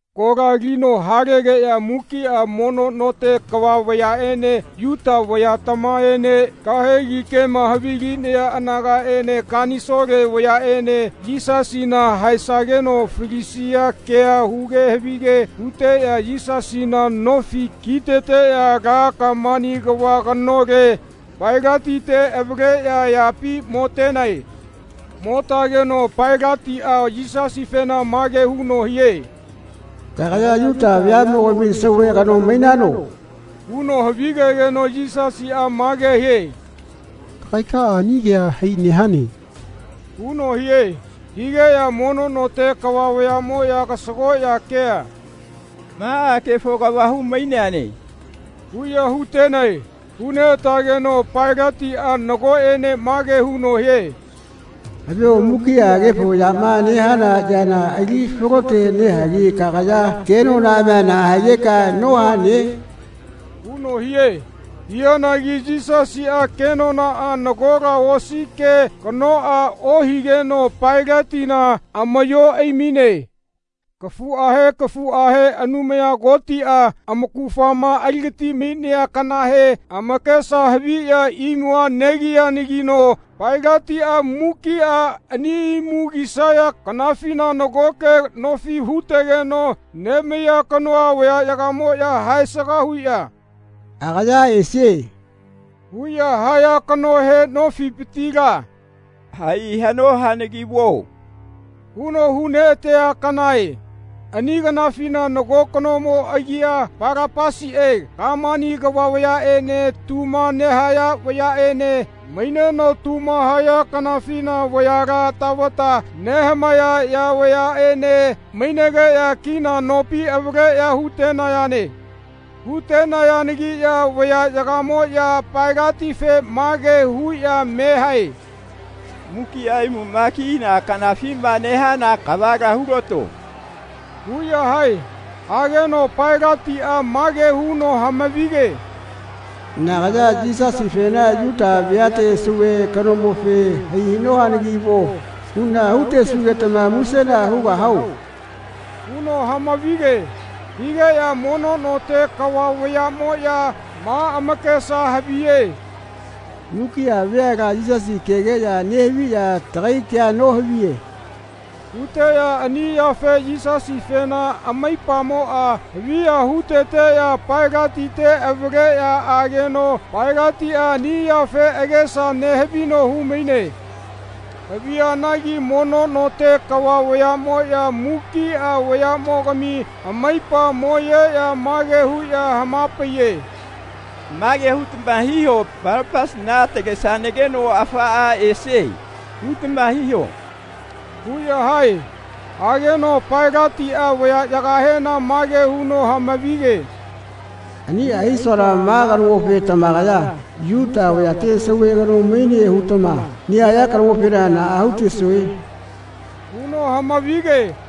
Kola alino halegeꞌya mukiꞌa mono note kava vayaꞌene Yuta vayatamaene kahegi kema havilinaya anagaꞌene kanisole vayaꞌene Yisasina haesageno falisia kea huge havige huteꞌya Yisasina nofi kiteteꞌya ala kamani kava kanole, Pailatite avaleꞌya ayapi motenae. Motageno Pailatiꞌa Yisasifena mage huno hie “Kagaya Yuta veaꞌmogami Sauve kano mainano?” huno havigegeno Yisasiꞌa mage hie “Kagaikaꞌa ani kea hai nehane.” huno hie. Higeꞌya mono note kava vayaꞌmoꞌya kasagoꞌya kea “Maꞌa kefo kava humainane.” huꞌya hutenae. Huneꞌatageno Pailatiꞌa nagoꞌene mage huno hie “Havio mukiꞌa kefo yama nehana yana ali falote nehagi kagaya kenonaꞌamia naꞌa higeka nohane?” huno hie. Hianagi Yisasiꞌa kenonaꞌa nagola osi ke kanoꞌa ohigeno Pailatina amaꞌyo aimaine. Kafuꞌahe kafuꞌahe Anumaya Kotiꞌa amaugafama aligatimainea kanahe amakesa haviꞌya imua negiyanagino Pailatiꞌa mukiꞌa ani imu kisaya kanafina nagoke nofi hutegeno nemaiya kanoa vayaꞌyagamoꞌya haesaga huꞌya “Agaya esie.” huꞌya haya kanohe nofipitila “Hai haꞌno hanagi vuo.” huno huneꞌatea kanae. Ani kanafina nago kanomo agia Palapasiꞌe kamani vayaꞌene tuma nehaya vayaꞌene maineno tuma haya kanafina vayala tavata nehamaeyaya vayaꞌene mainegeꞌya kina nopi avaleꞌya hutenayane. Hutenayanagiꞌya vayaꞌyagamoꞌya Pailatife mage huꞌya me hae “Mukiꞌa imuma kina kanafima nehana kavala hulato.” huꞌya hae. Hageno Pailatiꞌa mage huno hamavige “Nagaya Yisasifena Yuta veate Sauve kanomofe ‘Hai haꞌno hanagi vuo.’ huꞌna hisugetama musena hugahao?” huno hamavige. Higeꞌya mono note kava vayaꞌmoꞌya ma amakesa haviye “Mukiꞌa veala Yisasi kegeꞌya nehaviꞌya tagai kea nohaviye.” huteꞌya ani yafe Yisasifena amaipamoꞌa haviya huteteꞌya Pailatite avaleꞌya ageno Pailatiꞌa ani yafe agesa nehavino humaine. Havianagi mono note kava vayaꞌmoꞌya mukiꞌa vayaꞌmogami amaipa moyeꞌya mage huꞌya hamapaiye “Mage hutama hiho ‘Palapasina atalesanageno afaꞌa esie.’ hutama hiho.” huꞌya hae. Hageno Pailatiꞌa vayaꞌyagahena mage huno hamavige “Aniꞌa hisuana ma kanomofe tamakaya Yuta vayate Sauve kano maine hutama nehaya kanomofena naꞌa hutesue?” huno hamavige.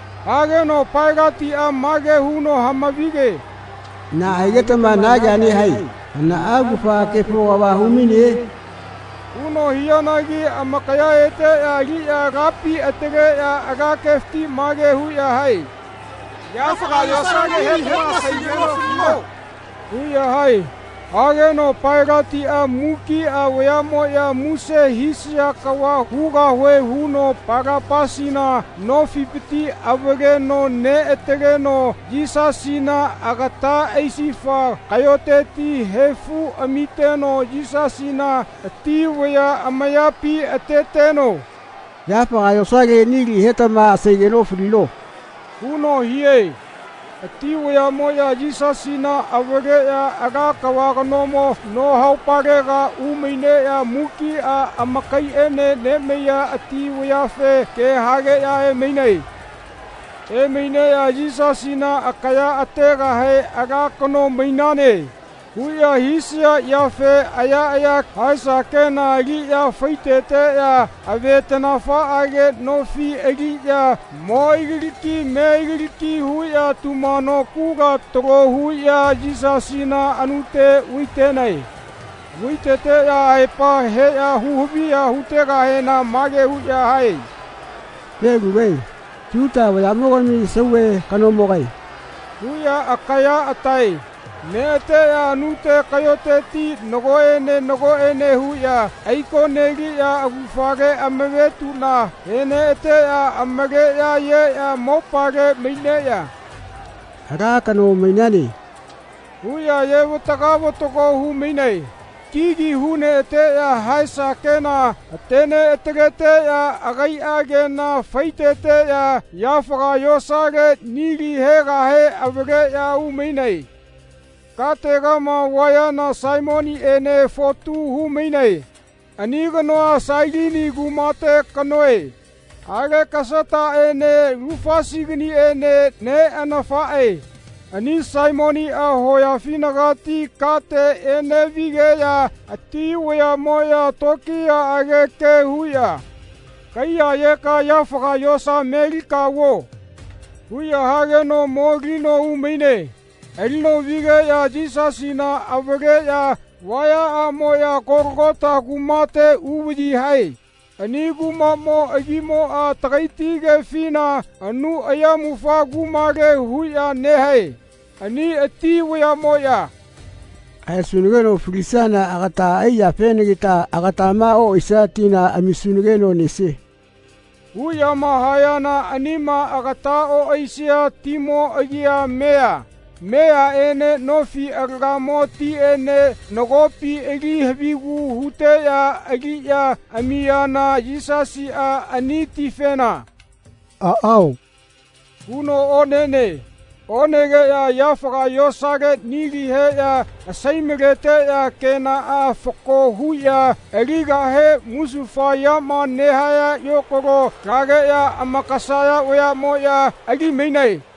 Hageno Pailatiꞌa mage huno hamavige “Naꞌa higetama na kea nehae? Hanaꞌa augafa kefo kava humaine?” huno hianagi amakaya eteꞌya aliꞌya alapi ataleꞌya ala kefiti mage huꞌya hae “Yafaga yosale nili hetama asaigeno falino.” huꞌya hae. Hageno Pailatiꞌa mukiꞌa vayaꞌmoꞌya muse hisaya kava hugahue huno Palapasina nofipiti avaleno neꞌataleno Yisasina agata aisifa kaꞌyoteti haifu amiteno Yisasina ati vaya amayapi ateteno “Yafaga yosale nili hetama asaigeno falino.” huno hie. Ati vayaꞌmoꞌya Yisasina avaleꞌya ala kava kanomo no haupalega umaineꞌya mukiꞌa amakaiꞌene nemaiya ati vayafe ke hageꞌya emainae. Emaineꞌya Yisasina akaya ategahe “Ala kano mainane.” huꞌya hisaya yafe ayaꞌaya haesa kena aliꞌya faiteteꞌya avetaꞌnafaꞌage nofi aliꞌya mo aigalaki me aigalaki huꞌya tumano kula talo huꞌya Yisasina anute vaitenae. Vaiteteꞌya aepa heꞌya huhaviya hutegahena mage huꞌya hae “Felugae. Yuta vayaꞌmogami sauve kanomogae.” huꞌya akaya atae. Neꞌateꞌya anute kaꞌyoteti nagoꞌene nagoꞌene huꞌya aikoneliꞌya augafale amavetuꞌna heneꞌateꞌya amaleꞌya ayeꞌya mopale maineꞌya “Ala kano mainane” huꞌya ayevataga vatago humainae. Kigi huneꞌateꞌya haesa kena hateneꞌataleteꞌya agaiꞌa kena faiteteꞌya yafaga yosale nili hegahe avaleꞌya umainae. Kategama vayana Saimoniꞌene fotu humainae. Ani kanoa Sailini kumate kanoe. Alekasataꞌene Lufasiganiene neꞌanafaꞌe. Ani Saimoniꞌa hoyafinagati kate eneꞌvigeꞌya ati vayaꞌmoꞌya tokiyaꞌage ke huꞌya “Kaiyayeka yafaga yosa melika vuo.” huꞌya hageno molino umaine. Alino vigeꞌya Yisasina avaleꞌya vayaꞌamoꞌya Kologota kumate uvaꞌyi hae. Ani kumaꞌmo agimoꞌa tagaiti kefina anu ayamufa kumale huꞌya nehae. Ani ati vayaꞌmoꞌya “Haesunageno falisiana agata ai yafenagita agatama oꞌaisia tina amisunageno nesie.” huꞌyama hayana anima agata oꞌaisia timo agia mea. Meaꞌene nofi alagamo tiꞌene nagopi ali havigu huteꞌya aliꞌya amiyana Yisasiꞌa ani tifena “Aꞌao.” huno onene. Onegeꞌya yafaga yosale nili heꞌya asaimaleteꞌya kenaꞌa fako huꞌya aligahe musufa yama nehaya yokalo lageꞌya amakasaya vayaꞌmoꞌya alimainae.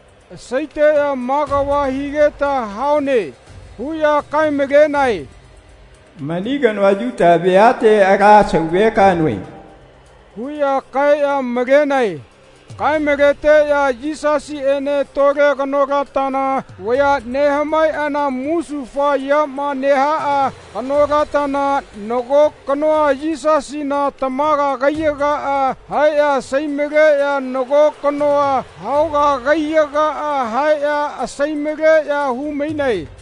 Asaiteꞌya “Ma kava higeta haune.” huꞌya kaemalenae “Mani kanoa Yuta veate ala Sauve kanoe.” huꞌya kaeꞌya malenae. Kaemaleteꞌya Yisasiꞌene tole kanolatana vaya nehamaeꞌana musufa yama nehaꞌa kanolatana nago kanoa Yisasina tamaga kaiyagaꞌa haeꞌya asaimaleꞌya nago kanoa haoga kaiyagaꞌa haeꞌya asaimaleꞌya humainae.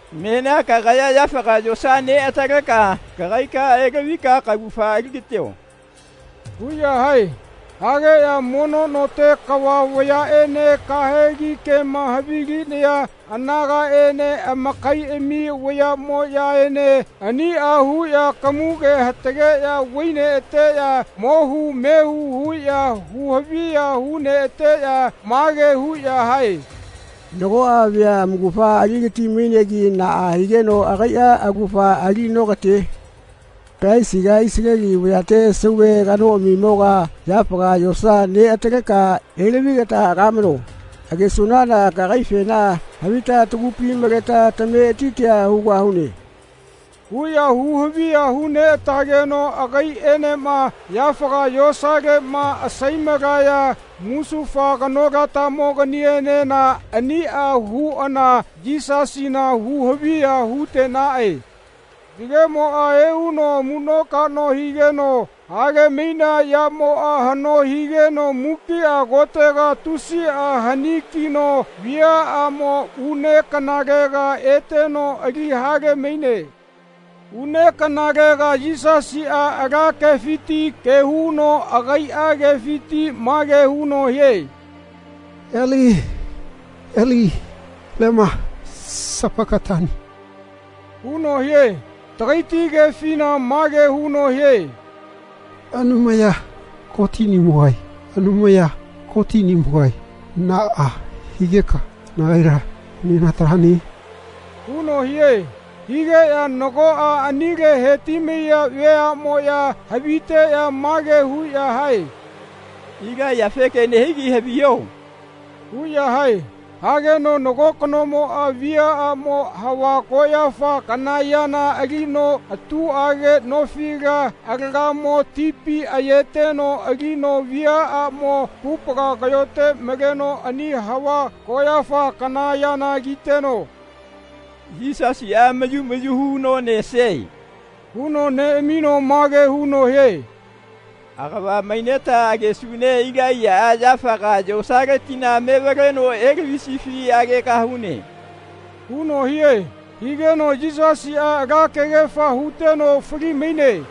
Menia kagaya yafaga yosa neꞌataleka kagaikaꞌa elavika kaugafa aligatio.” huꞌya hae. Hageꞌya mono note kava vayaꞌene kahegi kema havilinaya anagaꞌene amakaiꞌami vayaꞌmoꞌyaene aniꞌa huꞌya kamuge hatageꞌya vaineꞌateꞌya mohu mehu huꞌya huhaviya huneꞌateꞌya mage huꞌya hae “Nagoꞌa vea amaugafa aligatimainegi naꞌa higeno agaiꞌa augafa ali nokatie. Kalaisiga Isaleli vayate Sauve kanoꞌamimoga yafaga yosa neꞌataleka elavigeta agamano. Agesunana kagaifena havita tagupi maleta tametitia hugahune.” huꞌya huhaviya huneꞌatageno agaiꞌenema yafaga yosaleꞌma asaimalaya musufa kanolatamoganienena aniꞌa huꞌana Yisasina huhaviya hutenaꞌe. Yagemoꞌa euno amuꞌnokaꞌno higeno halemainea yamoꞌa haꞌno higeno mukiꞌa kotega tusiꞌa hanikino viaꞌamo une kanalega eteno ali halemaine. Une kanalega Yisasiꞌa ala kefiti ke huno agaiꞌa kefiti mage huno hie “Eli Eli lema sapakatani.” huno hie. Tagaiti kefina mage huno hie “Anumaya Kotiꞌnimogae, Anumaya Kotiꞌnimogae naꞌa higeka nagaila nenatalane?” huno hie. Higeꞌya nagoꞌa anile hetimaiya veaꞌmoꞌya haviteꞌya mage huꞌya hae “Ilaiyafe ke nehigi haviho.” huꞌya hae. Hageno nago kanomoꞌa viaꞌamo hava koꞌyafa kana yana alino atuꞌage nofi alagamo tipi ayeteno alino viaꞌamo kupaga kaꞌyote maleno ani hava koꞌyafa kana yana kiteno “Yisasiꞌa mayu mayu huno nesie.” huno neꞌamino mage huno hie “Agava maineta agesune Ilaiyaꞌa yafaga yosaletila mevaleno elavisifi agegahune.” huno hie. Higeno Yisasiꞌa ala kegefa huteno falimaine.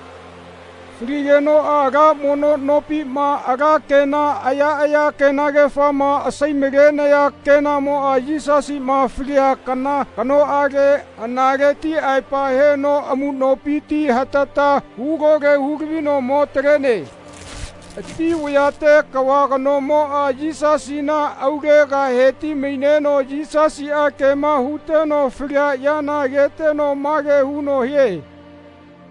Faligenoꞌa ala mono nopima ala kena ayaꞌaya kenagefama asaimalenaya kenamoꞌa Yisasiꞌma falia kana kanoꞌale analeti aepa heno amuꞌnopiti hatata hulole hulavino mo talene. Ati vayate kava kanomoꞌa Yisasina aulega hetimaineno Yisasiꞌa kema huteno falia yana ageteno mage huno hie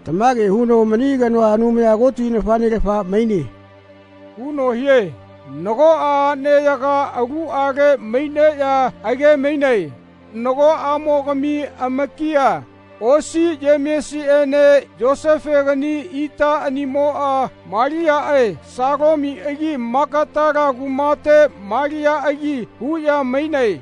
“Tamage huno mani kanoa Anumaya Koti nafaꞌnelafa maine.” huno hie. Nagoꞌa aꞌneyaga aluꞌale maineꞌya agemainae. Nagoꞌamogami amakia, osi Yemesiꞌene Yosefegani itaꞌanimoꞌa Maliaꞌe Salomiꞌagi Magatala kumate Maliaꞌagi huꞌya mainae.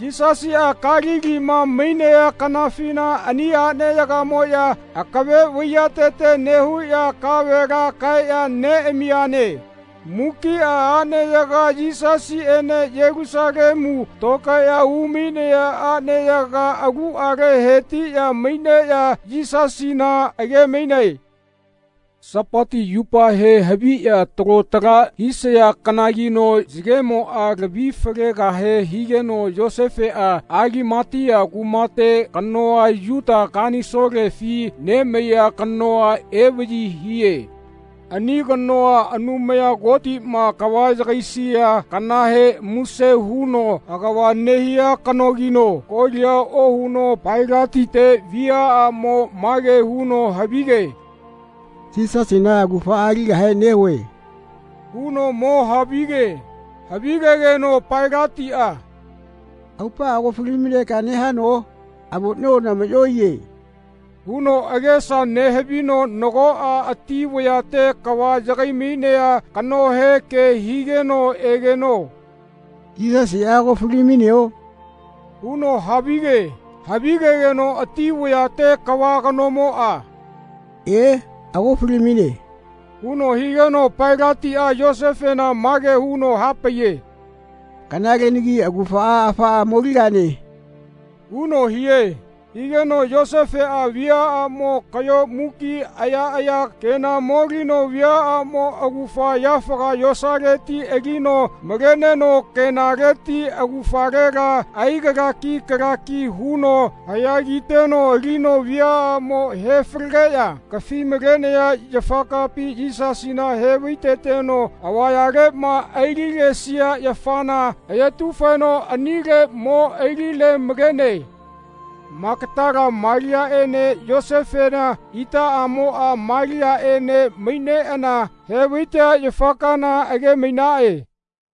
Yisasiꞌa Kalilima mainea kanafina ani aꞌneyagamoꞌya akave vaiyatete nehuꞌya kavela kaeꞌya neꞌamiyane. Mukiꞌa aꞌneyaga Yisasiꞌene Yelusalemu tokaeꞌya umainaya aꞌneyaga aluꞌale hetiꞌya maineꞌya Yisasina agemainae. Sapati yupahe haviꞌya talo tala hisaya kanagino yagemoꞌa lavi falegahe higeno Yosefeꞌa Alimatia kumate kanoa Yuta kanisolefi nemaiya kanoa evaꞌyi hie. Ani kanoa Anumaya Kotiꞌma kava yagaisia kanahe muse huno agava nehia kanogino kolia ohuno Pailatite viaꞌamo mage huno havige “Yisasina augafaꞌa aligahe nehue.” huno mo havige. Havigegeno Pailatiꞌa “Aupaꞌa ago falimainegeka nehano? Avoꞌnio namaꞌyo aiye.” huno agesa nehavino nagoꞌa ati vayate kava yagaimainea kanohe ke higeno egeno “Yisasiꞌa ago falimaineo?” huno havige. Havigegeno ati vayate kava kanomoꞌa “E, ago falimaine.” huno higeno Pailatiꞌa Yosefena mage huno hapaiye “Kanalelagi augafa afaꞌa moligane.” huno hie. Higeno Yosefeꞌa viaꞌamo kaꞌyo muki ayaꞌaya kena molino viaꞌamo augafa yafaga yosaleti alino maleneno kenaleti augafalela aigalaki kalaki huno haꞌya kiteno alino viaꞌamo hefalegeꞌya kafimalenaya yafakapi Yisasina hevaiteteno avayaleꞌma aililesia yafana ayetufeno anile mo aililemalene. Magatala Maliaꞌene Yosefena itaꞌamoꞌa Maliaꞌene maineꞌana hevaitea yafa kaana agemainaꞌe.